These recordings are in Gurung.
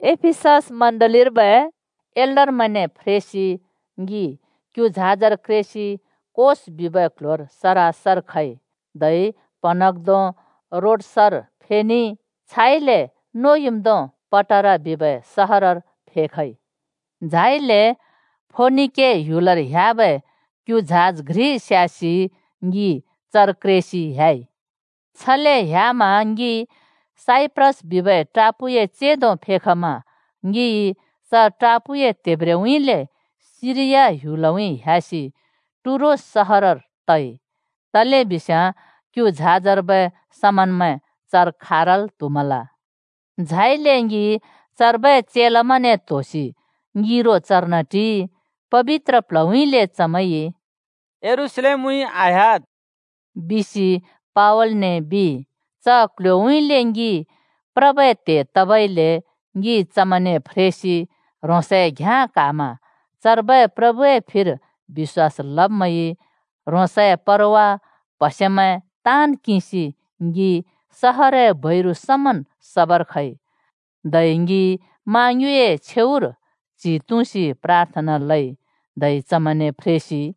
एफिसस चर्चर्बै एल्डरमैंने फ्रेसि ङि क्यु झाजर क्रेसि कोस बिबै क्ल्ह्‍योर सरासर खइ, धै प्हँन्हाँग्धों रोडसर फेखइ, छाइले नुइँम्दों पटारा बिबै सहरर फेखइ। झाइले फोनिके ह्‍युलर ह्‍याबै क्यु झाज घ्रि स्यासि ङि चर क्रेसि ह्‍याइ। छले ह्‍यामा ङि साइप्रस बिबै टापूए चेंदो फेखमा ङिइ च टापूए त्हेब्ब्रेउँइँले सिरिया ह्‍युलउँइँ ह्‍यासि टुरोस सहरर तइ, तलेबिस्याँ क्यु झाजर्बै समनमैं चर खारल् त्हुमल। झाइले ङि चर्बै चेलामैंने त्होसि ङिरो चर्न टिइ। पबित्र प्ल्हउँइँले चमैंइ “यरूशलेमउँइँ आह्‍याद्!” बिसि पावलने बिइ। च क्ल्ह्‍योउँइँले ङि प्रबै त्हे तबइले ङि चमैंने फ्रेसि ह्रोंसए घ्याँ क्हामा। चर्बै प्रभुए फिर बिश्‍वास लब्मैंइ ह्रोंसए परवा, प्हसेमैं ताँन् किंसि ङि सहरए बैरु समन् सबर खइ। धै ङि मा ङ्युँइए छेउर च्हि तुँसि प्राथना लइ, धै चमैंने फ्रेसि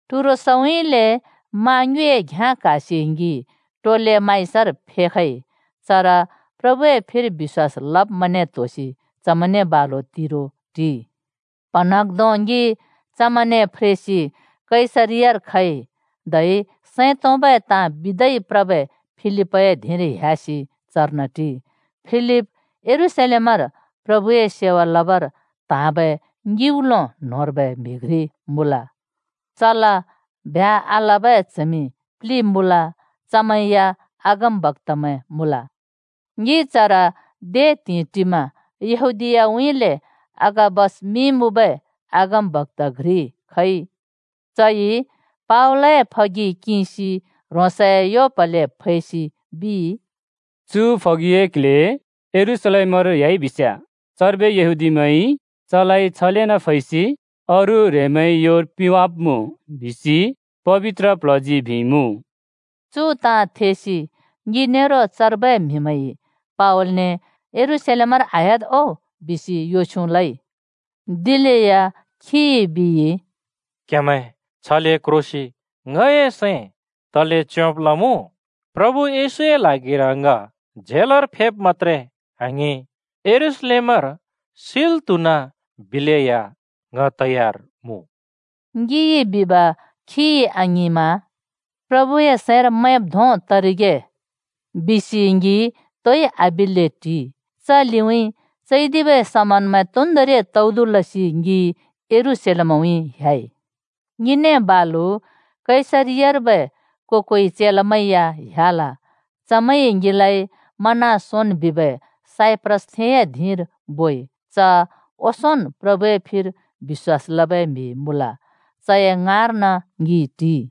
टुरोसउँइँले मा ङ्युँइए घ्याँ क्हासि ङि टोलेमाइसर फेखइ। चर प्रभुए फिर बिश्‍वास लब्मैंने त्होसि चमैंने बालु तिरो टिइ। प्हँन्हाँग्धों ङि चमैंने फ्रेसि कैसरियार खइ, धै सैं तोंबै ताँ बिदै प्रबै फिलिपए धिंर ह्‍यासि चर्न टिइ। फिलिप यरूशलेमर प्रभुए सेवा लबर त्हाँबै ङिउलो न्‍होंर्बै म्‍हि घ्रि मुँल। चला ब्ह्‍या आलबै च्हमि प्लि मुँल। चमैं या अगमबक्‍तामैं मुँल। ङि चर दे त्हिंइ टिमा यहूदीयाउँइँले अगाबस मिं मुँबै अगमबक्‍ता घ्रि खइ। चइ पावलए फगि किंसि ह्रोंसए यो प्हले फैसि बिइ, “‘चु फगिए क्ल्हे यरूशलेमर ह्‍याइ बिस्याँ चर्बै यहूदीमैंइ चलाइ छलेना फैसि अरू ह्रेंमैंए योर पिंवाब्मुँ,’ बिसि पबित्र प्ल्हजी बिइमुँ।” चु ताँ थेसि ङि नेरो चर्बै म्हिमैं क्ह्रिसि पावलने “यरूशलेमर आह्‍याद् ओ!” बिसि यो छ्युँ लइ। दिलेया खिइ बिइ, “क्‍हेमैं छले क्रोसि ङए सैं तले च्योंब् लमुँ? प्रभु येशूए ल्हागिर ङ जेलर फैब् मत्‍त्रे आङिं, यरूशलेमर सिल् त्हुनाबिलेया ङ तयार मुँ।” ङिइ बिब खिइ आङिंमा “प्रभुए सैंर मैंब् धों तरिगे,” बिसि ङि तोइ आबिल्‍ले टिइ। च लिउँइँ ङिइ चैदिबै समानमैं तोन्दोंरि तौदु लसि यरूशलेमउँइँ ह्‍याइ। ङिने बालु कैसरियार्बै को-कोइ चेलामैं या ह्‍याल। चमैंइ ङिलाइ मनासोन बिबै साइप्रसथेंए धिंर बोइ। च ओंसोंन प्रभुए फिर बिश्‍वास लबै म्हि मुँल। चए ङाँर्न ङि टिइ।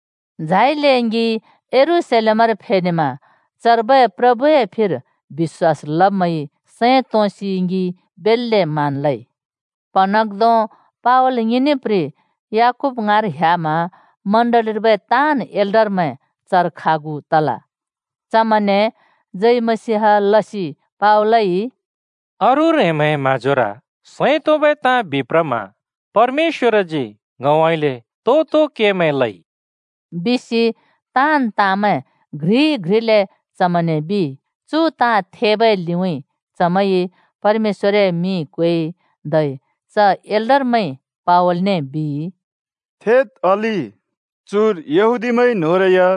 झाइले ङि यरूशलेमर फेनेमा, चर्बै प्रभुए फिर बिश्‍वास लब्मैंइ सैं तोंसि ङि बेल्‍ले मान लइ। प्‍हँन्हाँग्‍धों पावल ङिने याकूब ङाँर ह्‍यामा चर्चर्बै ताँन् एल्डरमैं चर खागु तल। चमैंने जय मसीह लसि पावलइ “अरू ह्रेंमैंए म्हाँजोर सैं तोंबै ताँ बिप्रमा परमेश्‍वरजी ङउँइँले तो-तो केमैं लइ,” बिसि ताँन् ताँमैं घ्रि-घ्रिले चमैंने बिइ। चु ताँ थेबै लिउँइँ चमैंइ परमेश्‍वरए मिं क्वेइ। धै च एल्डरमैंइ पावलने बिइ, “थेद् अलि, चुर यहूदीमैं न्होंरै या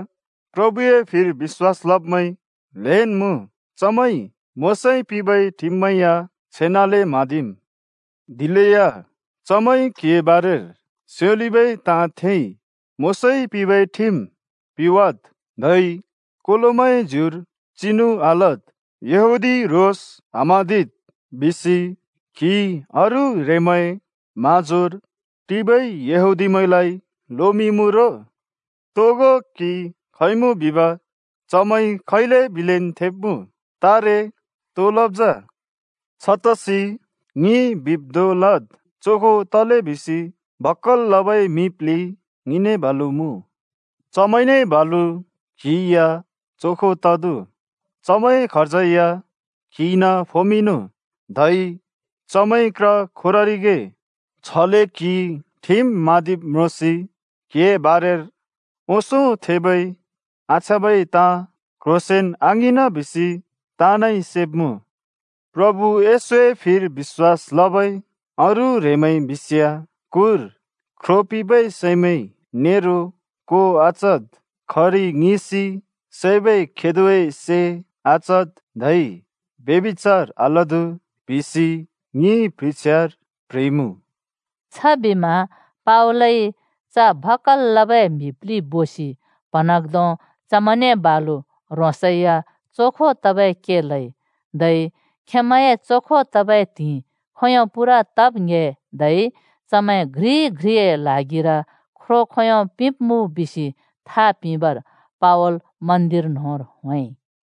प्रभुए फिर बिश्‍वास लब्‍मैं ल्हेंन् मुँ। चमैंइ मोशाइ पिंबै ठिममैं या छेनाले म्हाँदिम्। दिलेया चमैंइ क्हिए बारेर स्योलिबै ताँ थेइ। ‘मोशाइ पिंबै ठिम पिवाद्, धै कोलोमैंए ज्युर चिनु आलद्, यहूदी रोस आम्हाँदिद्,’ बिसि क्हिइ अरू ह्रेंमैंए म्हाँजोर टिबै यहूदीमैंलाइ लोमिंइँमुँ रो। तोगो क्हि खइमुँ बिब चमैंइ खैले बिलेन् थेब्मुँ। तारे तो लब् जा? छतसि ङिइ बिब् धों लद्। चोखो तले बिसि भक्‍कल् लबै म्हि प्लि ङिने बालु मुँ। चमैंने बालु क्हि या चोखो तदु, चमैंए खर्ज या क्हिइन फोमिंनु। धै चमैंइ क्र खोररिगे। छले क्हिइ ठिम म्हाँदिब् म्रोंसि क्हिए बारेर ओंसों थेबै आछ्याँबै ताँ क्ह्रोंसेंन् आङिंन बिसि ताँनइ सेब्मुँ। प्रभु येशूए फिर बिश्‍वास लबै अरू ह्रेंमैंइ बिस्याँ, ‘कुर ख्रो पिंबै सैमैं नेरो को आचदु, खरि ङिसि सैबै खेदोए से आचदु, धै ब्यभिचार आलदु,’ बिसि ङिइ प्ह्रिछ्यार प्ह्रिइमुँ।” छबिमा पावलइ च भक्‍कल् लबै म्हि प्लि बोसि प्हँन्हाँग्धों चमैंने बालु ह्रोंसै या चोखो तबै के लइ। धै खेंमैंए चोखो तबै त्हिंइ खोंयों पूरा तब् ङ्‍हे धै चमैं घ्रि-घ्रिए ल्हागिर ख्रो खोंयों पिंब्मुँ बिसि था पिंबर पावल मन्दिर न्होंर होंइ।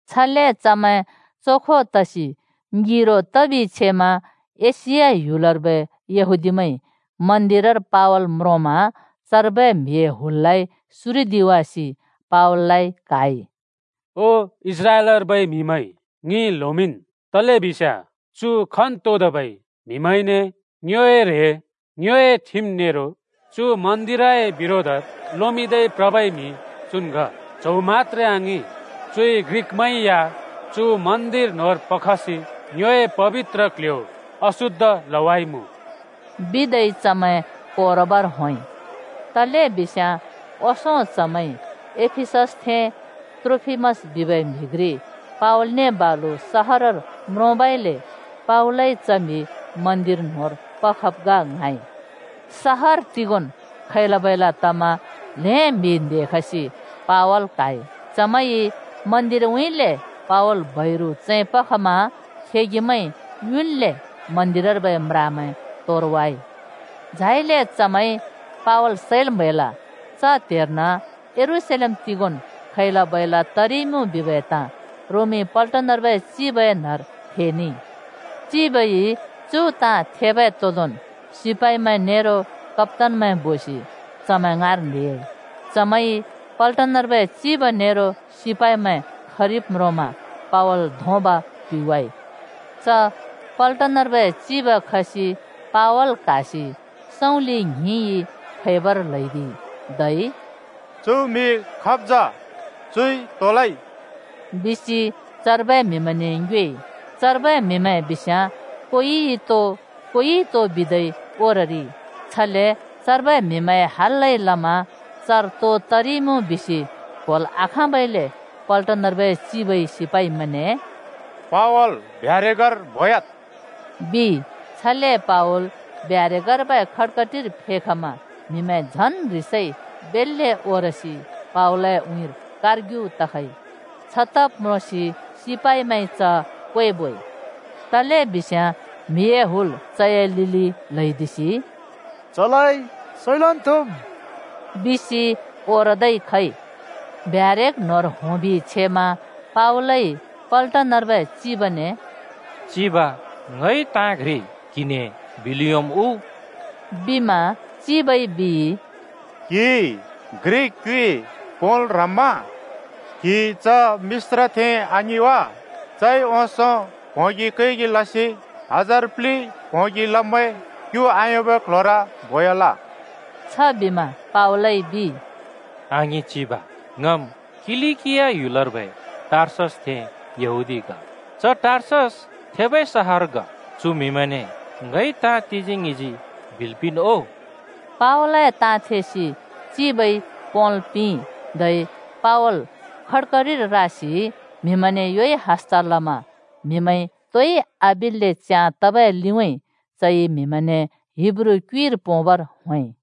छले चमैं चोखो तसि ङिरो तबि छेमा एशिया ह्‍युलर्बै यहूदीमैंइ मन्दिरर पावल म्रोंमा चर्बै म्हिए हुललाइ सुरिदिवासि पावललाइ क्हाइ। “ओ इस्राएलर्बै म्हिमैं, ङि ल्होमिंन्! तलेबिस्याँ चु खन्तोंदोंबै म्हिमैंने ङ्योए ह्रें, ङ्योए ठिम नेरो चु मन्दिरए बिरोधर लोमिंदै प्रबै म्हि चुन् ग। च्हौ मत्‍त्रे आङिं, चुइ ग्रिकमैं या चु मन्दिर न्होंर पखसि ङ्योए पबित्र क्ल्ह्‍यो अशुद्ध लवाइमुँ,” बिदै चमैं ओरबर होंइ। तलेबिस्याँ ओंसों चमैंइ एफिससथें त्रोफिमस बिबै म्हि घ्रि पावलने बालु सहरर म्रोंबइले पावलइ च म्हि मन्दिर न्होंर पखब ग ङ्हाँइ। ताँन् सहरर खैला-बैला तमा ल्हें म्हि न्हेखसि पावल क्हाइ। चमैंइ मन्दिरउँइँले पावल बैरु चैं पखमा खेगिमैंइ युन्ले मन्दिरर्बै म्रामैं तोरावाइ। झाइले चमैंइ पावल सैल् म्हैल। च त्हेर्न यरूशलेम तिगोंन् खैला-बैला तरिइमुँ बिबै ताँ रोमी पल्टनर्बै चिबए न्हर थेनेइ। चिबइ चु ताँ थेबै तोंदोंन् सिपाइमैं नेरो कप्‍तानमैं बोसि चमैं ङाँर न्हेयाइ। चमैंइ पल्टनर्बै चिब नेरो सिपाइमैं खरिब् म्रोंमा पावल धोंब पिवाइ। च पल्टनर्बै चिब खसि पावल क्हासि सँउँलि ङ्हिंइ फैबर ल्हैदिइ। धै “चु म्हि खाब् जा? चुइ तो लइ?” बिसि चर्बै म्हिमैंने ङ्योएइ। चर्बै म्हिमैं न्होंरि कोइ तिथो, कोइ अर्कोन् ताँ लसि ओरइ। छले चर्बै म्हिमैंए हल्‍लाइ लमा चर तो तरिइमुँ बिसि क्होल् आखाँबइले पल्टनर्बै चिबइ सिपाइमैंने “पावल ब्यारेकर बोयाद्!” बिइ। छले पावल ब्यारेकर्बै खटकटिर फेखमा म्हिमैं झन् ह्रिसइ बेल्‍ले ओरसि पावलए उँइँर कारग्यु तखइ। छतब् म्रोंसि सिपाइमैंइ च क्वेबोइ। तलेबिस्याँ म्हिए हुल चए लिलि ल्हैदिसि “च सैलन् त्हुम्!” बिसि ओरदै खइ। ब्यारेक न्होंर होंबि छेमा पावलइ पल्टनर्बै चिबने “चिब, ङइ ताँ घ्रि क्हिने बिल् योंम् उ?” बिमा चिबइ बिइ, “क्हिइ ग्रिक क्युइ पोंल् ह्रम्मा? क्हि च मिश्रथें आङिं वा? चइ ओंसों प्होंगि कैगि लसि हजार प्लि प्होंगि लब्मैं क्यु आयोंबै क्ल्ह्‍योर बोयाल।” छबिमा पावलइ बिइ, “आङिं चिब। ङम् किलिकिया ह्‍यलर्बै टार्ससथें यहूदी ग। च टार्सस थेबै सहर ग। चु म्हिमैंने ङइ ताँ तिजी-ङ्हिजी बिल् पिंन् ओ।” पावलए ताँ थेसि चिबइ पोंल् पिंइ, धै पावल खटकटिर रासि म्हिमैंने योइ हस्त लमा म्हिमैं तोइ आबिल्‍ले च्याँ तबै लिउँइँ चइ चमैंने हिब्रू क्युइर पोंबर होंइ।